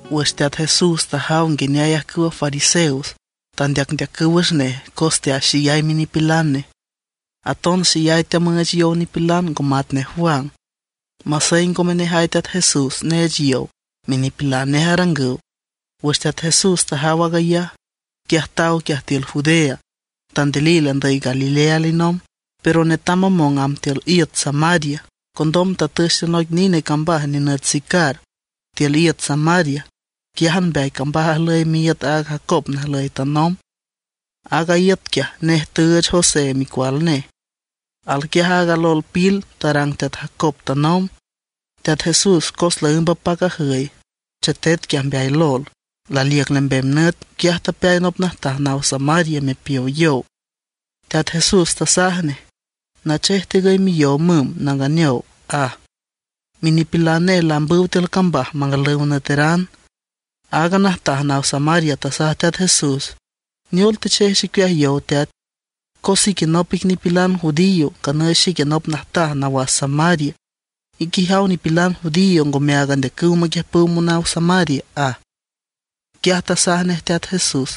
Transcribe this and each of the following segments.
Wüx Teat Jesús tajaw nguineay ajcüwa fariseos tandeacndeacüw wüx nej cos teaxeyay minipilan nej, aton xeyay teamüüch yow nipilan ngo matnej Juan; masey ngome nejay Teat Jesús neech yow, minipilan nej arangüw. Wüx Teat Jesús tajaw aag ayaj, quiaj taw quiaj tiül Judea, tandilil andüy Galilea alinomb. Pero netam mamong amb tiül iüt Samaria. Condom tatüch tiül noic nine cambaj nenüt Sicar tiül iüt Samaria. Quiájan mbeay cambaj ajlüy miíüt aaga Jacob najlüy tanomb. Aaga iüt quiaj nej tüüch José micual nej. Alquiaj aaga lol pil tarang teat Jacob tanomb. Teat Jesús cos laǘmb apac ajüy, chetet quiaj mbeay lol, laliüc lembem nüt. Quiaj tapeay nop najtaj naw Samaria mepiow yow. Teat Jesús tasaj nej: ―Nachej tigüy miyow müm, nanganeow ―aj. Minipilan nej laambüw tiül cambaj mangalüw nüeteran. Aaga najtaj naw Samaria tasaj Teat Jesús: ―¿Neol techej xicueaj yow, teat? Cos ique nop ic nipilan judío, nganüy xique nop najtaj nawas Samaria. Ique ijaw nipilan judío ngome áag andeacüw maquiüjpüw monaw Samaria ―aj. Quiaj tasaj nej Teat Jesús: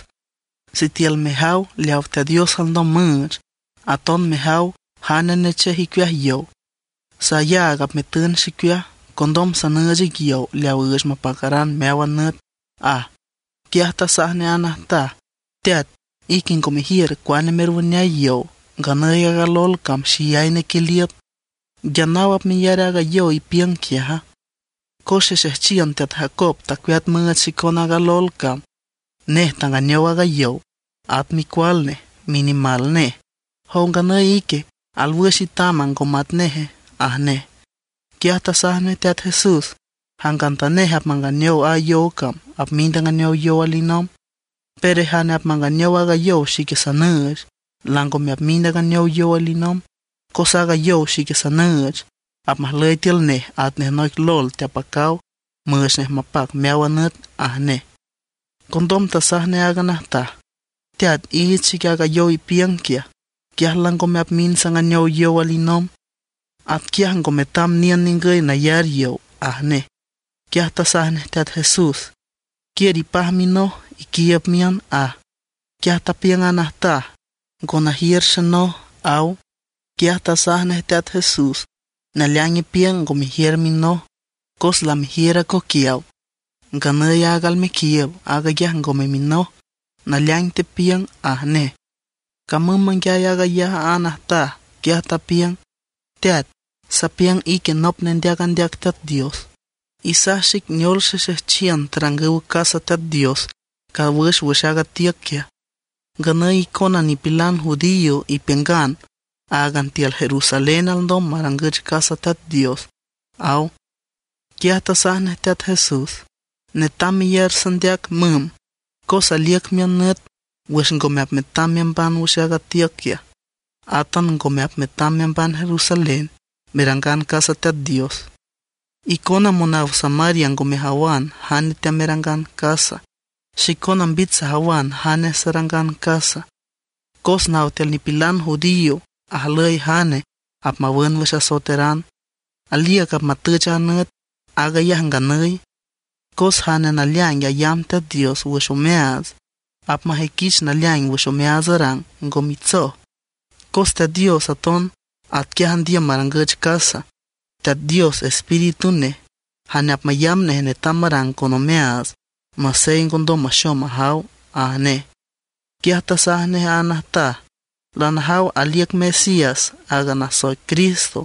―Sitiül mejaw leaw Teat Dios alndom müüch, aton mejaw jane nechej icueaj yow, sayaag apmetün xicueaj, condom sanüüch ic yow leaw üüch mapacaran meáwan nüt ―aj. Quiaj tasaj nej a najtaj: ―Teat, ique ngo mejiür cuane merwüneay yow, nganüy aaga lol cam xeyay nequiliüt. ¿Nguia naw apmeyar aaga yow ipiüng quiaja? Cos xexejchiün teat Jacob tacueat müüch xicon aaga lol cam. Nej tanganeow aaga yow, at micual nej, minimal nej. ¿Jow nganüy ique, alwüx itama, ngo matneje? ―aj nej. Quiaj tasaj nej Teat Jesús: ―Jangantanej apmanganeow a yow cam apmind anganeow yow alinomb. Pero jane apmanganeow aaga yow xique sanüüch, langome apmind anganeow yow alinomb. Cos aaga yow xique sanüüch, apmajlüy tiül nej atnej noic lol teapacaw müüch nej mapac meáwan nüt ―aj nej. Condom tasaj nej aaga najtaj: ―Teat, iich xic aaga yow ipiüng quiaj, quiaj langome apmind sanganeow yow alinomb, atquiaj ngo metam niün ningüy nayar yow ―aj nej. Quiaj tasaj nej Teat Jesús: ―Quiür ipaj minoj, iquiiüb miün ―aj. Quiaj tapiüng a najtaj: ―Ngo najiür xenoj ―aw. Quiaj tasaj nej Teat Jesús: ―Naleaing ipiüng ngo mejiür minoj; cos lamejiür acoquiaw. Nganüy aag almequiiüb, aag ayaj ngome minoj. Naleaing tepiüng ―aj nej. Camüm manguiay aag ayaj a najtaj, quiaj tapiüng: ―Teat, sapiüng ique nop nendeac andeac Teat Dios. Isaj xic neol xexejchiün tarangüw casa Teat Dios cawüx wüx aaga tiüc quiaj, nganüy icona nipilan judío ipiüngan áagan tiül Jerusalén alndom marangüch casa Teat Dios ―aw. Quiaj tasaj nej Teat Jesús: ―Netam meyar sandeac, müm, cos aliüc miün nüt wüx ngome apmetam meamban wüx aaga tiüc quiaj, átan ngome apmetam meamban Jerusalén merangan casa Teat Dios. Icona monaw Samaria ngo mejawan jane teamerangan casa; xicona mbich sajawan jane sarangan casa, cos naw tiül nipilan judío ajlüy jane apmawün wüx asoeteran. Aliüc apmatüch a nüt, aag ayaj nganüy, cos jane naleaing ayamb Teat Dios wüx omeaats, apmajüiquich naleaing wüx omeaats arang, ngo mitsoj. Cos Teat Dios aton atquiaj andiüm marangüch casa. Teat Dios Espíritu nej; jane apmayamb nej netam marang con omeaats, masey ngondom maxom majaw ―aj nej. Quiaj tasaj nej a najtaj: ―Lanajaw aliüc Mesías, aaga nasoic Cristo.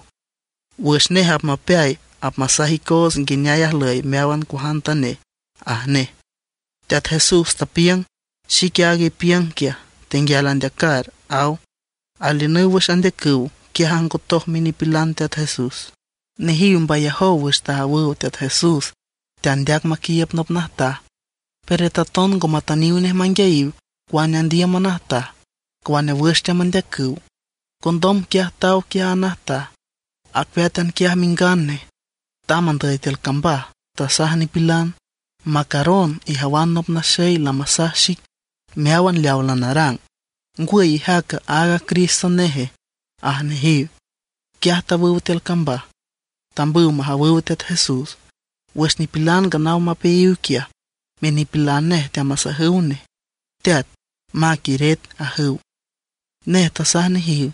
Wüx nej apmapeay apmasaj icoots nguineay ajlüy meáwan cuajantanej ―aj nej. Teat Jesús tapiüng: ―Xique aag ipiüng quiaj, tenguial andeacar ―aw. Aliünüw wüx andeacüw, quiaj ajngotoj minipilan Teat Jesús. Nejiw mbayajow wüx tajawüw Teat Jesús teandeac maquiiüb nop najtaj. Pero taton ngo matüniw nej manguiayiw cuane andiüm a najtaj, cuane wüx teamandeacüw. Condom quiaj taw quiaj a najtaj, acueátan quiaj mingan nej; tamb andüy tiül cambaj, tasaj nipilan: ―Macaron, ijawan nop naxey lamasaj xic meáwan leaw lanarang. ¿Ngwüy ijaca, aaga Cristo neje? ―aj nejiw. Quiaj tawüw tiül cambaj, tambüw majawüw Teat Jesús. Wüx nipilan nganaw mapeayiw quiaj, minipilan nej teamasajüw nej: ―Teat, mac iret ―ajüw. Nej tasaj nejiw: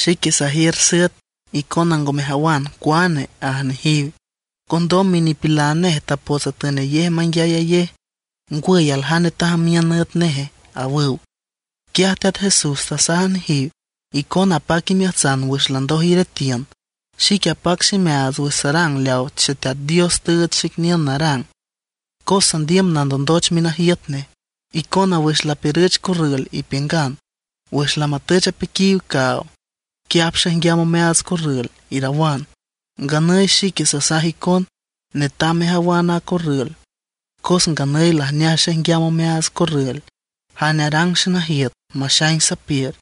―Xique sajiür süet, icona ngo mejawan cuane ―aj nejiw. Condom minipilan nej tapots atünayej menguiayayej: ―¿Ngwüy, aljane tajamiün üet neje? ―awüw. Quiaj Teat Jesús tasaj nejiw: ―Icona apac imeajtsan wüx landoj iretiün, xique apac ximeaats wüx sarang leaw Xeteat Dios tüüch xic niün narang, cos sandiüm nandondoch minajiüt nej. Icona wüx lapiürüch corrül ipiüngan: “Wüx lamatüch apiquiw caaw, quiaj apxaijnguiam omeaats corrül”, irawan. Nganüy xique sasaj icon: Netam mejawan a corrül, cos nganüy lajneaj xaijnguiam omeaats corrül. Jane arang xenajiüt maxaing sapiür,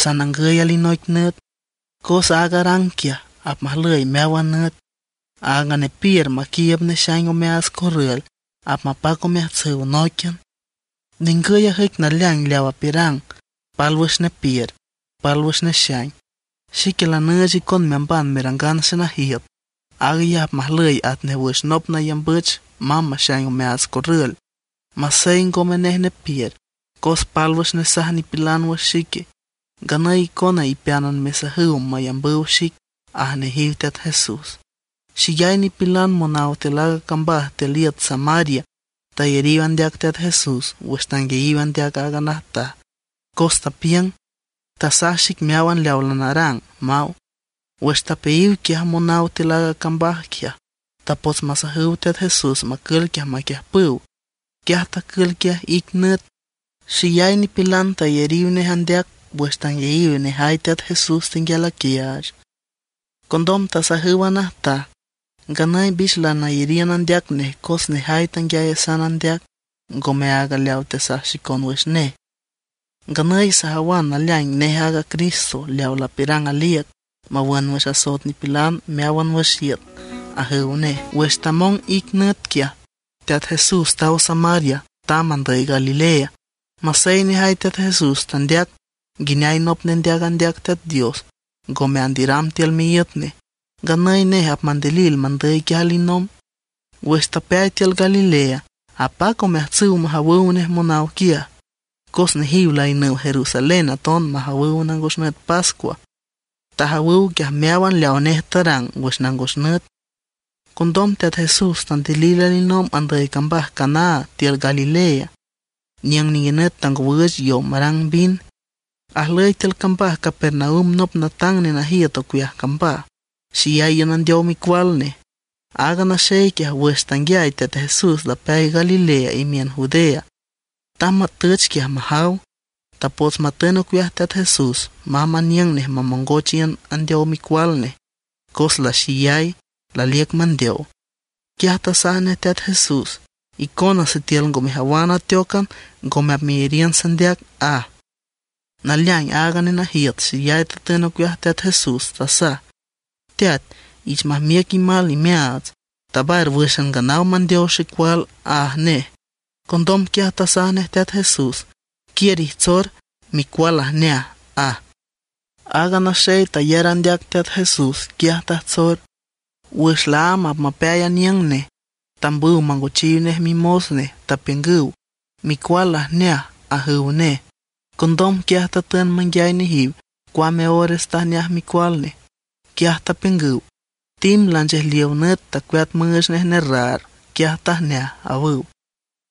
sanangüy alinoic nüt, cos aaga arang quiaj apmajlüy meáwan nüt. Aaga nepiür, maquiiüb nexaing omeaats corrül, apmapac omeajtsüw nóiquian. Ningüy ajüic naleaing leaw apiürang: “Pálwüx nepiür, pálwüx nexaing”. Xique lanüüch icon meamban merangan xenajiüt. Aag ayaj apmajlüy atnej wüx nop mayambüch mamb maxaing omeaats corrül, masey ngome nej nepiür; cos pálwüx nesaj nipilan wüx xique, nganüy icona ipeánan mesajüw mayambüw xic ―aj nejiw Teat Jesús. Xeyay nipilan monaw tiül aaga cambaj tiül iüt Samaria tayariw andeac Teat Jesús wüx tanguiayiw andeac aaga najtaj, cos tapiüng: “Tasaj xic meáwan leaw lanarang”, maw. Wüx tapeayiw quiaj monaw tiül aaga cambaj quiaj, tapots masajüw Teat Jesús macül quiaj maquiüjpüw. Quiaj tacül quiaj ic nüt. Xeyay nipilan tayariw nej andeac wüx tanguiayiw nejay Teat Jesús tenguial aquiaach. Condom tasajüw a najtaj: ―Nganüy mbich lanayariün andeac nej cos nejay tanguiayasan andeac, ngome áagan leaw tesaj xicon wüx nej. Nganüy sajawan naleaing nej aaga Cristo leaw lapiürang aliüc mawün wüx asoet nipilan meáwan wüx iüt ―ajüw nej. Wüx tamong ic nüt quiaj, Teat Jesús taw Samaria, tamb andüy Galilea. Masey nejay Teat Jesús tandeac nguineay nop nendeac andeac Teat Dios ngome andiüram tiül miíüt nej, nganüy nej apmandilil mandüy quiaj alinomb. Wüx tapeay tiül Galilea, apac omeajtsüw majawüw nej monaw quiaj, cos nejiw laiünüw Jerusalén aton majawüw nangos nüt pascua. Tajawüw quiaj meáwan leaw nej tarang wüx nangos nüt. Condom Teat Jesús tandilil alinomb andüy cambaj Caná tiül Galilea, niüng ninguinüt tangowüüch yow marang vin. Ajlüy tiül cambaj Capernaum nop natang nenajiüt ocueaj cambaj, xeyay iün andeow micual nej. Aaga naxey quiaj wüx tanguiay Teat Jesús lapeay Galilea imiün Judea, tamb matüch quiaj majaw. Tapots matün ocueaj Teat Jesús mamb aniüng nej mamongoch iün andeow micual nej, cos laxeyay, laliüc mandeow. Quiaj tasaj nej Teat Jesús: ―Icona sitiül ngo mejawan ateócan ngome apmeyariün sandeac ―aj. Naleaing aaga nenajiüt xeyay tatün ocueaj Teat Jesús, tasaj: ―Teat, ich majmiüc imal imeaats, tabar wǘxan nganaw mandeow xecual ―aj nej. Condom quiaj tasaj nej Teat Jesús: ―Quiür ijtsor, micual lajneaj ―aj. Aaga naxey tayar andeac Teat Jesús, quiaj tajtsor. Wüx laámb apmapeay aniüng nej, tambüw mangochiw nej mimos nej, tapiüngüw: ―Micual lajneaj ―ajüw nej. Condom quiaj tatün manguiay nejiw cuame ores tajneaj micual nej. Quiaj tapiüngüw: ―Tim lanchejliow nüt tacueat müüch nej nerraar, quiaj tajneaj ―awüw.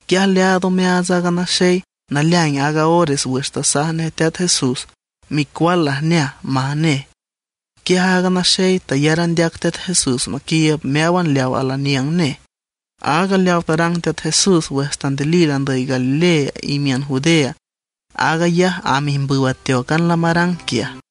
Quiaj leaad omeaats aaga naxey, naleaing aaga ores wüx tasaj nej Teat Jesús: “Micual lajneaj”, maj nej. Quiaj aaga naxey tayar andeac Teat Jesús maquiiüb meáwan leaw alaniüng nej. Aaga leaw tarang Teat Jesús wüx tandilil andüy Galilea imiün Judea, aag ayaj amb ijmbüw ateócan lamarang quiaj.